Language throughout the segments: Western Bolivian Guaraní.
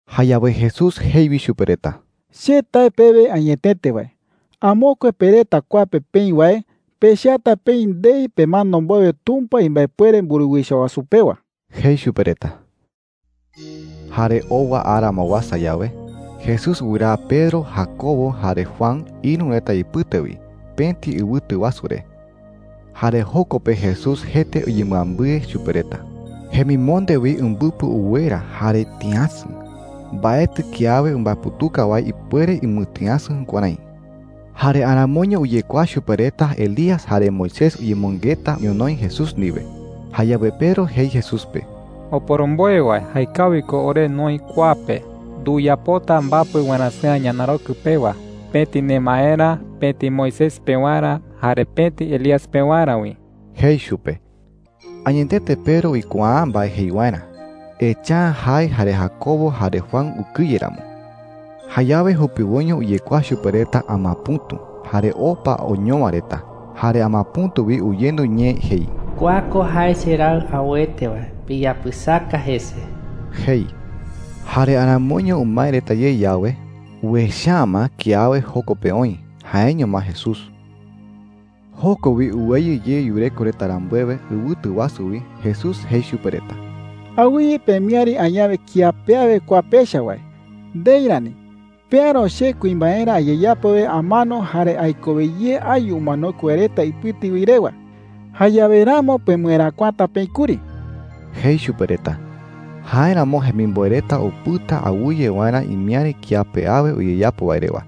Jayawe Jesús jei wi chupe reta: “Che tae pewe añetete wae, amokue pe reta kua pe peï wae pechata peï ndei pemano mbowe Tumpa imbaepuere mburuwicha wasu pewa,” jei chupe reta. Jare owa ara ma uasa yawe, Jesús wɨraa Pedro, Jacobo, jare Juan ïru reta ipɨte wi pëti ɨwɨtu wasu re. Jare joko pe Jesús jete uyembɨambɨe chupe reta. Jemimonde wi umbɨpɨ uwera jare tïasɨ. Mbaetɨ kiawe umbaeputuka wae ipuere umɨtïasɨ jukuärái. Jare aramoiño uyekuaa chupe reta Elías jare Moisés uyemɨngeta ñonoï Jesús ndiwe. Jayawe Pedro jei Jesús pe: “Oporomboe wae, jaekawi ko ore noï kua pe,” jei chupe. “Nduyapota mbapɨ warasɨ̈a ñanarokɨ pewa – pëti nemaerä, pëti Moisés pewarä, jare pëti Elías pewarä wi,” jei chupe. Añetete Pedro uikuaa’ä mbae jei waerä, echa’ä jae jare Jacobo jare Juan ukɨye ramo. Jayawe jupiwoiño uyekuaa chupe reta amapɨ̈tu jare opa oñowa reta. Jare amapɨ̈tu wi uyendu ñee jei: “Kua ko jae cheRaɨ auete wae. Piyapɨsaka jese,” jei. Jare aramoiño umae reta ye yawe, uecha’ä ma kiawe joko pe oï – jaeño ma Jesús. Joko wi uweyɨ ye yureko reta rambuewe ɨwɨtu wasu wi, Jesús jei chupe reta: “Awɨye pemiäri añawe kía pe awe kua pecha wae. Ndei rani. Peäro che kuimbaerä ayeyapo wae amano jare aikowe ye ayu umanokue wae reta ipɨte wi rewa. Jayawe ramo pemɨeräkuata peï kuri,” jei chupe reta. Jáeramo jemimboe reta upɨta awɨye waerä imiäri kía pe awe uyeyapo wae rewa.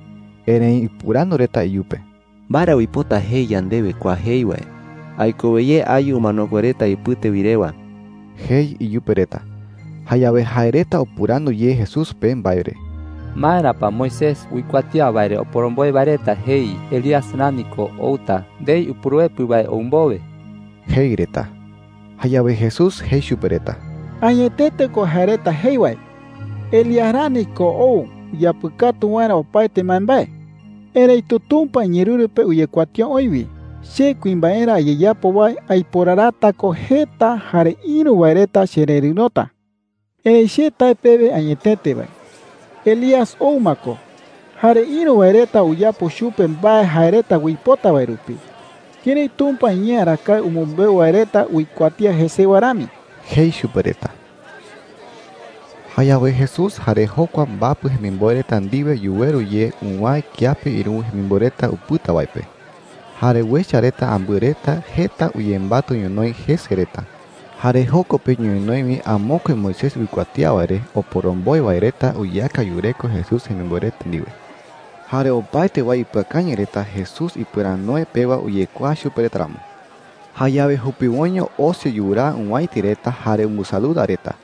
Erëi upɨrandu reta iyupe: “¿Mbae ra uipota jei yandewe kua jei wae: ‘aikowe ye ayu umanokue wae reta ipɨte wi rewa’?” jei iyupe reta. Jayawe jae reta upɨrandu ye Jesús pe mbae re: “¿Maera pa Moisés uikuatía wae re oporomboe wae reta jei Elías rani ko outa ndei Upuruepɨ wae ou mbowe?” jei reta. Jayawe Jesús jei chupe reta: “Añetete ko jae reta jei wae. Elías rani ko ou uyapɨkatu waerä opaete mbaembae,” jei. “Erëitu Tumpa iñeerɨru pe uyekuatía oï wi che kuimbaerä ayeyapo wae aiporarata ko jeta jare ïru wae reta chererɨ̈rota,” jei. “Erëi che tae pewe añetete wae, Elías ou ma ko, jare ïru wae reta uyapo chupe mbae jae reta uipota wae rupi, kërái Tumpa iñee arakae umɨmbeu wae reta uikuatía jesewa rami,” jei chupe reta. Jayawe Jesús jare jokua mbapɨ jemimboe reta ndiwe yuweru ye uwäe kiape ïruwe jemimboe reta upɨta wae pe. Jare uecha reta ambɨe reta jeta uyembatɨ ñonoï jese reta. Jare joko pe ñonoï wi amokue Moisés uikuatía wae re oporomboe wae reta uyeaka yureko Jesús jemimboe reta ndiwe. Jare opaete wae ipɨakañɨ reta Jesús ipɨranoe pewa uyekuaa chupe reta ramo. Jayawe jupiwoiño osi yuraa owäiti reta jare umbɨsaluda reta.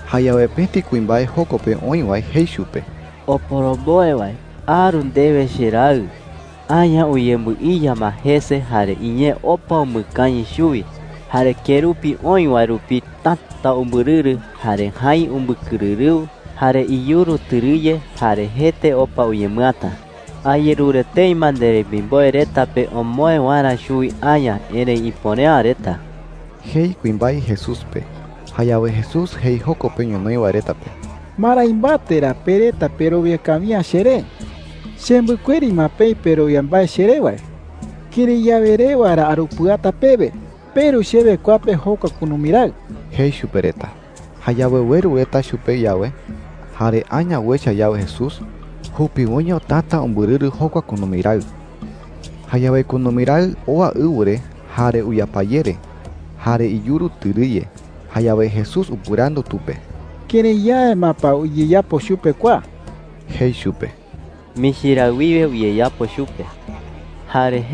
Jayawe pëti kuimbae joko pe oï wae jei chupe: “Oporomboe wae, aru ndewe cheraɨ,” jei chupe. “Aña uyembɨiya ma jese jare iñee opa umɨkañɨ chuwi. Jare kerupi oï wae rupi täta umbɨrɨrɨ. Jare jäi umbɨkɨrɨrɨu, jare iyuru tɨrɨye, jare jete opa uñemɨata,” jei. “Ayerure tëi ma nderemimboe reta pe omoë waerä chuwi aña, erëi ipuere’ä reta,” jei kuimbae Jesús pe. Jayawe Jesús jei joko pe ñonoï wae reta pe: “¿Marái mbate ra pe reta perowia kawi’ä cheré? Chembɨkueri ma peï perowia mbae cheré wae. ¿Kërái yawe rewa ra arupɨata pewe? Peru chewe kua pe jokua kunumi raɨ,” jei chupe reta. Jayawe ueru reta chupe yawe, jare aña uecha yawe Jesús, jupiwoiño täta umbɨrɨrɨ jokua kunumi raɨ. Jayawe kunumi raɨ oa ɨwɨ re, jare uyapayere, jare iyuru tɨrɨye. Jayawe Jesús upɨrandu tu pe: “¿Kërái yawe ma pa uyeyapo chupe kua?” jei chupe. “Michi raɨ wiwe uyeyapo chupe,” jei tu parawete.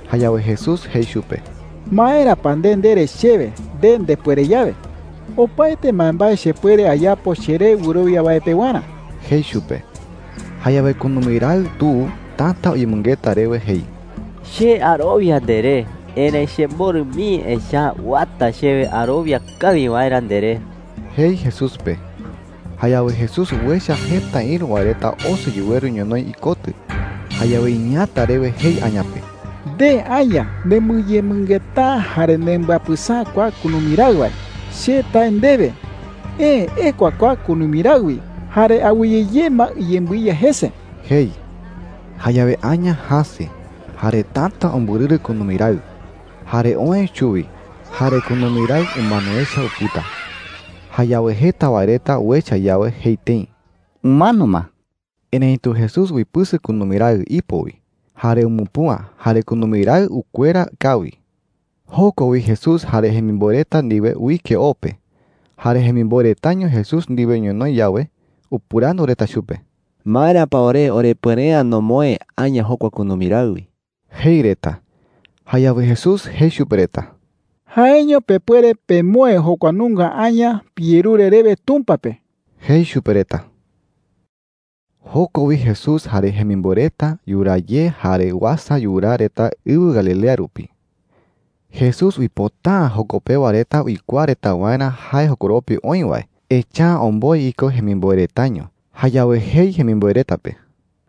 Jayawe Jesús jei chupe: “¿Maera pa nde ndere chewe, ‘nde ndepuere yawe’?” jei. “Opaete mbaembae chepuere ayapo cheré wɨrowia wae pewarä,” jei chupe. Jayawe kunumi raɨ tu täta uyemɨngeta rewe jei: “¡Che arowia nderé! Erëi chemborɨ mii, echa’ä uata chewe arowia kawi waerä nderé,” jei Jesús pe. Jayawe Jesús uecha jeta ïru wae reta osi yuweru ñonoï ikotɨ. Jayawe iñeeäta rewe jei aña pe: “Nde aña nembɨyemɨngeta’ä jare nembɨapɨsa’ä kua kunumi raɨ wae, che tae ndewe, eë ekua kua kunumi raɨ wi jare awɨye ye ma iyembɨiya jese,” jei. Jayawe aña jäse, jare täta umbɨrɨrɨ kunumi raɨ, jare oë chuwi. Jare kunumi raɨ umano echa upɨta. Jayawe jeta wae reta uecha yawe, jei tëi: “Umano ma.” Erëitu Jesús uipɨsɨ kunumi raɨ ipo wi jare umupüa. ¡Jare kunumi raɨ ukuera kawi! Joko wi Jesús jare jemimboe reta ndiwe uike o pe. Jare jemimboe retaño Jesús ndiwe ñonoï yawe, upɨrandu reta chupe: “¿Maera pa ore orepuere’ä nomoë aña jokua kunumi raɨ wi?” jei reta. Jayawe Jesús jei chupe reta: “Jaeño pepuere pemoë jokua nunga aña piyerure rewe Tumpa pe,” jei chupe reta. Joko wi Jesús jare jemimboe reta yuraa ye jare uasa yuraa reta ɨwɨ Galilea rupi. Jesús uipota’ä joko pewa reta uikuaa reta waerä jae jokoropi oï wae, echa’ä omboe iko jemimboe retaño. Jayawe jei jemimboe reta pe: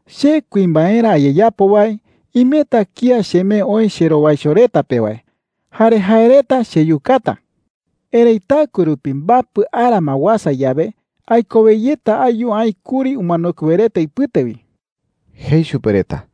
“Che kuimbaerä ayeyapo wae, imeta kía chemee oï cherowaicho reta pe wae. Jare jae reta cheyukata,” jei. “Erëi taɨkue rupi mbapɨ ara ma uasa yawe, aikowe yeta ayu aï kuri umanokue wae reta ipɨte wi,” jei chupe reta.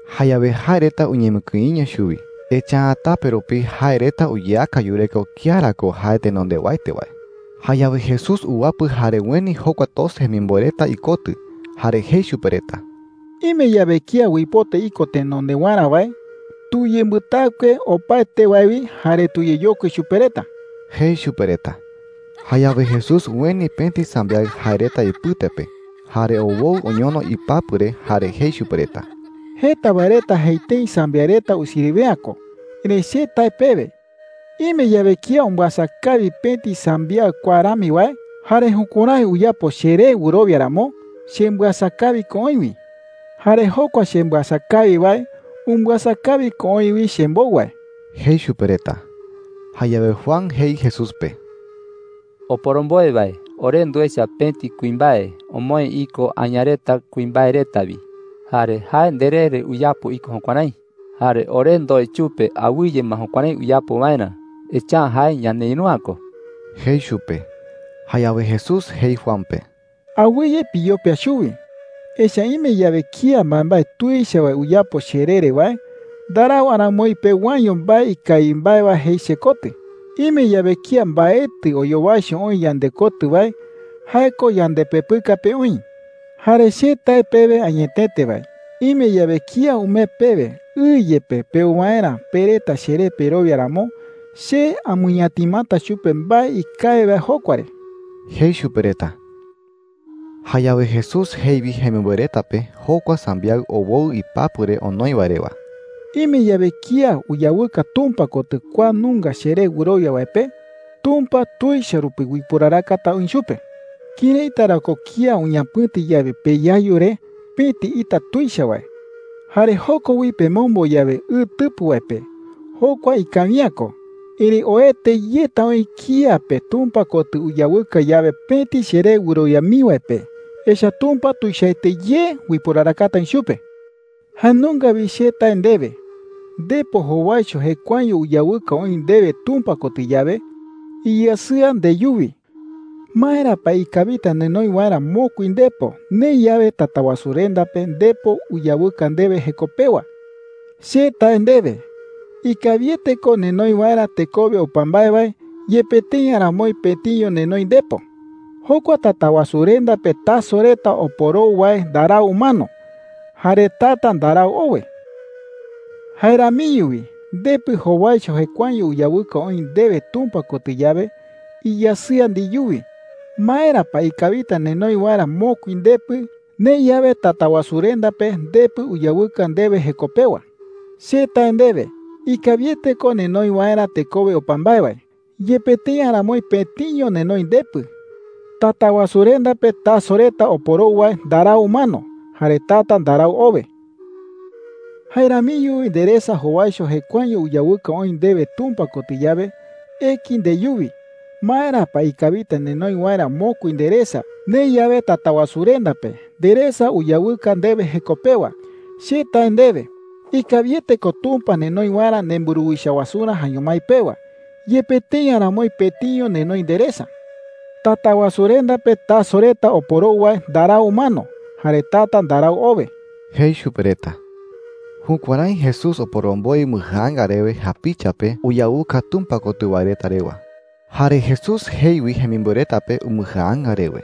Jayawe jae reta uñemɨkïiño chuwi. Echa’ä tape rupi jae reta uyeaka yureko kía ra ko jae tenondewaete wae. Jayawe Jesús uwapɨ jare ueni jokua doce jemimboe reta ikotɨ. Jare jei chupe reta: “Ime yawe kía uipota iko tenondewarä wae, tuyembɨtaɨkue opaete wae wi jare tuyeyokui chupe reta,” jei chupe reta. Jayawe Jesús ueni pëti sambiaɨ jae reta ipɨte pe jare owoɨ oñono ipapɨ re. Jare jei chupe reta: “Jeta wae reta jei tëi sambiaɨ reta usiriwe’ä ko. Erëi che tae pewe, ime yawe kía umbɨasa kawi pëti sambiaɨ kua rami wae, jare jukuärái uyapo cheré wɨrowia ramo, chembɨasa kawi ko oï wi,” jei. “Jare jokua chembɨasa kawi wae, umbɨasa kawi ko oï wi chembou wae,” jei chupe reta. Jayawe Juan jei Jesús pe: “Oporomboe wae, ore nduecha pëti kuimbae omoë iko aña reta kuimbae reta wi. Jare jae nderee re uyapo iko jukuärái,” jei. “Jare ore ndoe chupe awɨye ma jukuärái uyapo waerä, echa’ä jae ñaneïru’ä ko,” jei chupe. Jayawe Jesús jei Juan pe: “Awɨye piyopia chuwi. Echa’ä ime yawe kía mbaembae tuicha wae uyapo cheree re wae, ndarau aramoi pewaeño mbae ikawi mbae wae jei chekotɨ,” jei. “Ime yawe kía mbaetɨ oyowaicho oï yandekotɨ wae, jae ko yandepepɨka pe oï,” jei. “Jare che tae pewe añetete wae, ime yawe kía umee pewe ɨ yepe peu waerä pe reta cheré perowia ramo, che amɨñatimata chupe mbae ikawi wae jokua re,” jei chupe reta. Jayawe Jesús jei wi jemimboe reta pe jokua sambiaɨ owoɨ ipapɨ re onoi wae rewa: “Ime yawe kía uyawɨka Tumpa kotɨ kua nunga cheré wɨrowia wae pe, Tumpa tuicha rupi uiporarakata oï chupe,” jei. “¿Këraita ra ko kía uñapɨ̈ti yawe peyayu re pëti ita tuicha wae, jare joko wi pemombo yawe ɨ tɨpɨ wae pe? Jokua ikawi’ä ko. ¡Erëi oete yeta oï kía pe Tumpa kotɨ uyawɨka yawe pëti cheré wɨrowia mii wae pe! Echa’ä Tumpa tuichaete ye uiporarakata oï chupe,” jei chupe reta. “Jae nunga wi che tae ndewe, ndepo jowaicho jekuaeño uyawɨka oï ndewe Tumpa kotɨ yawe, iyasɨa ndeyuwi. ¿Maera pa ikawita nenoi waerä mokui ndepo, neï yawe Tatawasurenda pe ndepo uyawɨka ndewe jeko pewa? Che tae ndewe, ikawiete ko nenoi waerä tekowe opa mbae wae, yepe tëi aramoi pëtiño nenoi ndepo,” jei chupe reta. “Jokua Tatawasurenda pe taso reta oporou wae ndarau umano, jare tata ndarau owe,” jei. “Jae ramiño wi ndepɨ jowaicho jekuaeño uyawɨka oï ndewe Tumpa kotɨ yawe, iyasɨa ndeyuwi. ¿Maera pa ikawita nenoi waerä mokui ndepɨ, neï yawe Tatawasurenda pe ndepɨ uyawɨka ndewe jeko pewa?” jei. “Che tae ndewe, ikawiete ko nenoi waerä tekowe opa mbae wae, yepe tëi aramoi pëtiño nenoi ndepɨ,” jei chupe reta. “Tatawasurenda pe taso reta oporou wae ndarau umano, jare tata ndarau owe,” jei. “Jae ramiño wi nderesa jowaicho jekuaeño uyawɨka oï ndewe Tumpa kotɨ yawe, eki ndeyuwi. ¿Maera pa ikawita nenoi waerä mokui nderesa, neï yawe Tatawasurenda pe nderesa uyawɨka ndewe jeko pewa? Che tae ndewe, ikawiete ko Tumpa nenoi waerä nemburuwicha wasurä jaeño mái pewa, yepe tëi aramoi pëtiño nenoi nderesa,” jei. “Tatawasurenda pe taso reta oporou wae ndarau umano, jare tata ndarau owe,” jei chupe reta. Jukuärái Jesús oporomboe umbɨjaanga rewe japicha pe uyawɨka Tumpa kotɨ wae reta rewa. Jare Jesús jei wi jemimboe reta pe umbɨjaanga rewe: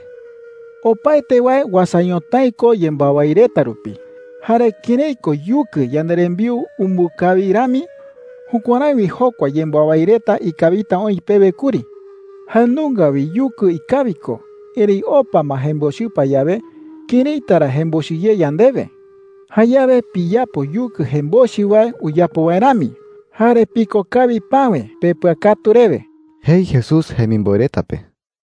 “Opaete wae uasa ñotái ko yembɨawái reta rupi. Jare kërái ko yukɨ yanderembiu umbɨkawi rami, jukuärái wi jokua yembɨawái reta ikawita oï pewe kuri,” jei. “Jae nunga wi yukɨ ikawi ko. Erëi opa ma jembochɨpa yawe, ¿këraita ra jembochɨ ye yandewe?” jei. “Jayawe piyapo yukɨ jembochɨ wae uyapo wae rami, jare piko kawi päwe pepɨakatu rewe,” jei Jesús jemimboe reta pe.